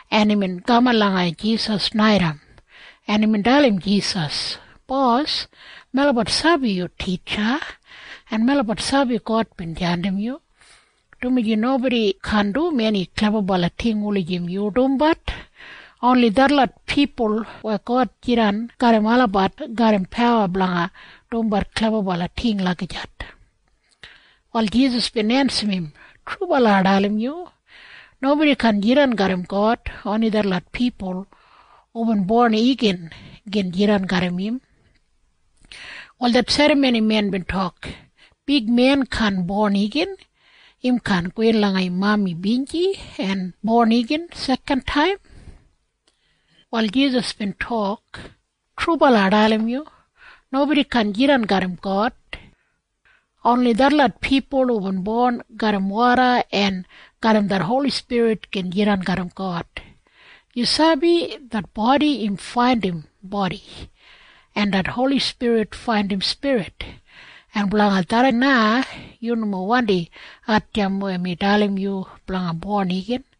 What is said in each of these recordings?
en imbin kaman langa Jisas naitaim, en imbin dalim Jisas, “Bos, melabat sabi yu titja, en melabat sabi God bin jandim yu, dumaji nobodi kaan dum eni klebabala ting wulijim yu dumbat. Oni detlot pipul weya God jidan garram olabat garram pawa blanga dumbat klebabala ting lagijat.” Wal Jisas bin ensim im, “Trubala ai dalim yu. Nobodi kaan jidan garram God. Oni detlot pipul hubin bon igin gin jidan garram im.” Wal det serramonimen bin tok, “Big men kaan bon igin! Im kaan gowin langa im mami binji en bon igin sekantaim!” Wal Jisas bin tok, “Trubala ai dalim yu. Nobodi kaan jidan garram God. Oni detlot pipul hubin bon garram woda en garram det Holi Spirit gin jidan garram God. “Yu sabi? Det bodi im faindim bodi, en det Holi Spirit faindim spirit. En blanga tharran na yu nomo wandi hatjamp weya mi dalim yu blanga bon igin.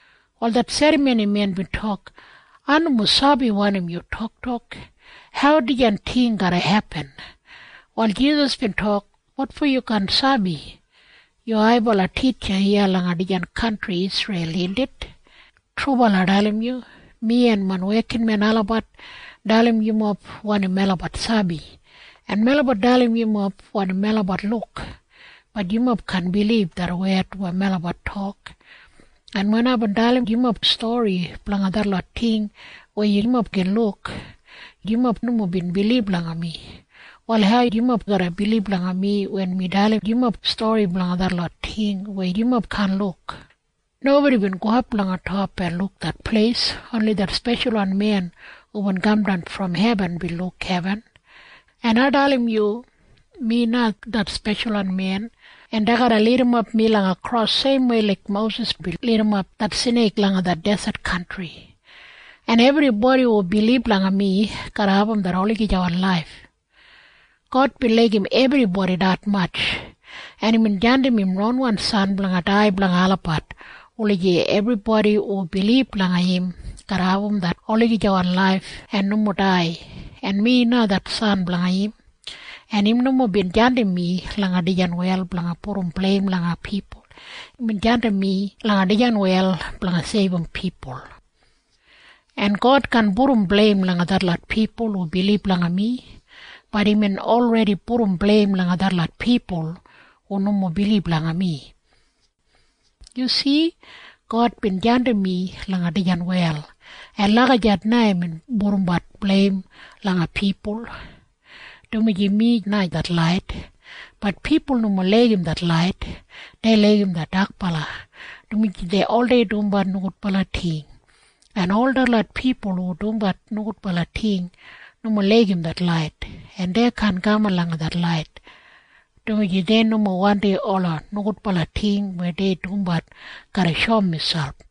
Wal det serramonimen bin tok, “Ai nomo sabi wanim yu toktok. Hau dijan ting garra hepin?” Wal Jisas bin tok, “Wotfo yu kaan sabi? Yu haibala titja iya langa dijan kantri Isreil, indit? Trubala ai dalim yu. Mi en main wekinmen olabat dalim yumob wanim melabat sabi, en melabat dalim yumob wanim melabat luk. Bat yumob kaan bilib det wed weya melabat tok. En wen aibin dalim yumob stori blanga detlot ting weya yumob gin luk, yumob nomo bin bilib langa mi. Wal hau yumob garra bilib langa mi wen mi dalim yumob stori blanga detlot ting weya yumob kaan luk? Nobodi bin gowap langa top en luk det pleis. Oni det Speshalwan Men hubin kamdan brom hebin bin luk hebin. En ai dalim yu. Mi na det Speshalwan Men, en dei garra lidimap mi langa kros seimwei laik Mosis bin lidimap det sneik langa det deset kantri, en ebribodi hu bilib langa mi garra abum det olagijawan laif. “God bin laigim ebribodi detmatj, en imbin jandim im ronwan san blanga dai blanga olabat, wulijim ebribodi hu bilib langa im garra abum det olagijawan laif en nomo dai. En mi na det San blanga im. En im nomo bin jandim mi langa dijan wel blanga pudum bleim langa pipul. Imbin jandim mi langa dijan wel blanga seibum pipul. En God kaan pudum bleim langa detlot pipul hu bilib langa mi. Bat imbin olredi pudum bleim langa detlot pipul hu nomo bilib langa mi. “Yu si? God bin jandim mi langa dijan wel. En lagijat na im pudumbat bleim langa pipul, dumaji mi na det lait. Bat pipul nomo laigim det lait. Dei laigim det dakbala, dumaji dei oldei dumbat nogudbala ting, en ol detlot pipul hu dumbat nogudbala ting nomo laigim det lait, en dei kaan kaman langa det lait, dumaji dei nomo wandim ola nogudbala ting weya dei dumbat garra shoum miselp.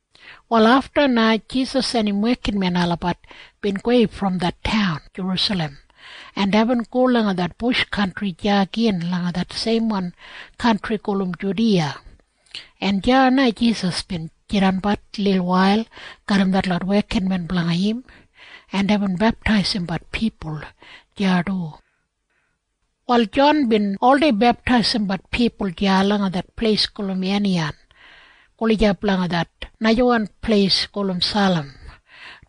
Wal afta na Jisas en im wekinmen olabat bin gowei brom det taun Jerusalem, en deibin go langa det bush kantri deya gin langa det seimwan kantri gulum Judiya, en deya na Jisas bin jidanbat lilwail garram detlot wekinmen blanga im, en deibin beptaisimbat pipul deya du. Wal Jon bin oldei beptaisimbat pipul deya langa det pleis gulum Aniyan gulijap langa det najawan pleis gulum Salim,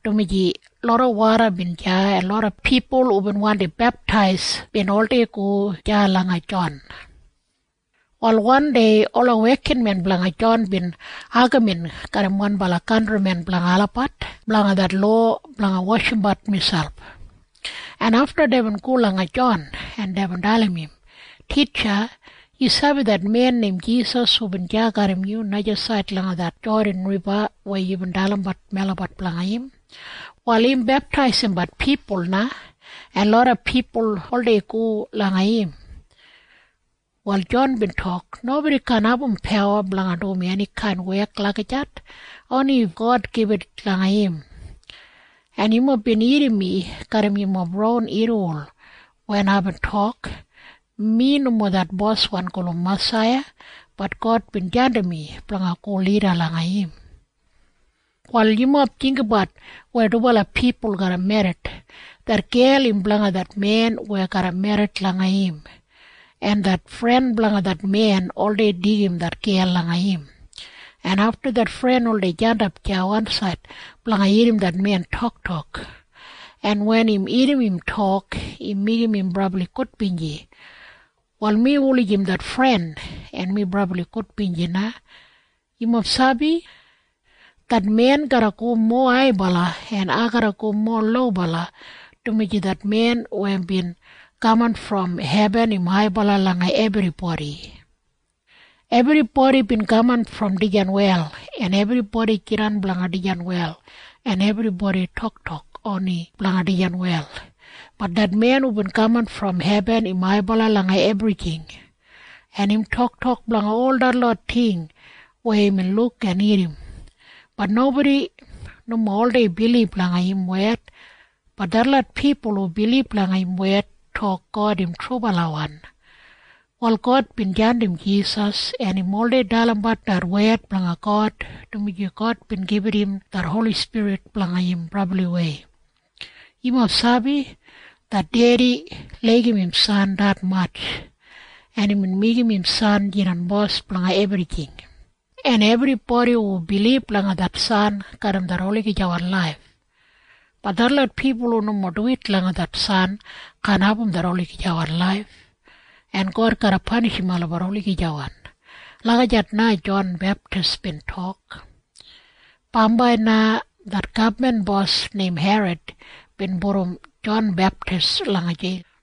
dumaji loda woda bin deya, en loda pipul hubin wandi beptais bin oldei go deya langa Jon. Wal wandei ola wekinmen blanga Jon bin agamin garram wanbala kantrimen blanga olabat blanga det lowa blanga washimbat miselp, en afta deibin go langa Jon, en deibin dalim im, “Titja, yu sabi det men neim Jisas hubin deya garram yu najasaid langa det Jodan Riba weya yubin dalimbat melabat blanga im? Wal im beptaisimbat pipul na, en loda pipul oldei go langa im.” Wal Jon bin tok, “Nobodi kaan abum pawa blanga dum enikain wek lagijat. Oni if God gibit langa im. En yumob bin irrim mi garram yumob ron irriwol wen aibin tok, ‘Mi nomo det Boswan gulum Masaiya. Bat God bin jandim mi blanga go lida langa im.’ “Wal yumob jinggabat weya dubala pipul garra merrit. Det gel im blanga det men weya garra merrit langa im, en det fren blanga det men oldei deigim det gel langa im, en afta det fren oldei jandap deya wansaid blanga irrim det men toktok, en wen im irrim im tok, im meigim im brabli gudbinji. “Wal mi wulijim det fren, en mi brabli gudbinji na. Yumob sabi? Det men garra go mowa haibala, en ai garra go mowa lobala, dumaji det men weya bin kaman brom hebin im haibala langa ebribodi. Ebribodi bin kaman brom dijan wel, en ebribodi jidan blanga dijan wel, en ebribodi toktok oni blanga dijan wel. Bat det men hubin kaman brom hebin im haibala langa ebrijing, en im toktok blanga ol detlot ting weya imbin luk en irrim. Bat nobodi nomo oldei bilib langa im wed. Bat detlot pipul hu bilib langa im wed tok God im trubalawan. “Wal God bin jandim Jisas, en im oldei dalimbat det wed blanga God, dumaji God bin gibit im det Holi Spirit blanga im brabliwei. Yumob sabi? Det Dedi laigim im San detmatj, en imbin meigim im San jidan bos blanga ebrijing, en ebribodi hu bilib langa det San garram det olagijawan laif. Bat detlot pipul hu nomo duwit langa det San kaan abum det olagijawan laif, en God garra panishim olabat olagijawan.” Lagijat na Jon Beptis bin tok. Bambai na det gabman bos neim Herod bin pudum Jon Beptis langa jeil.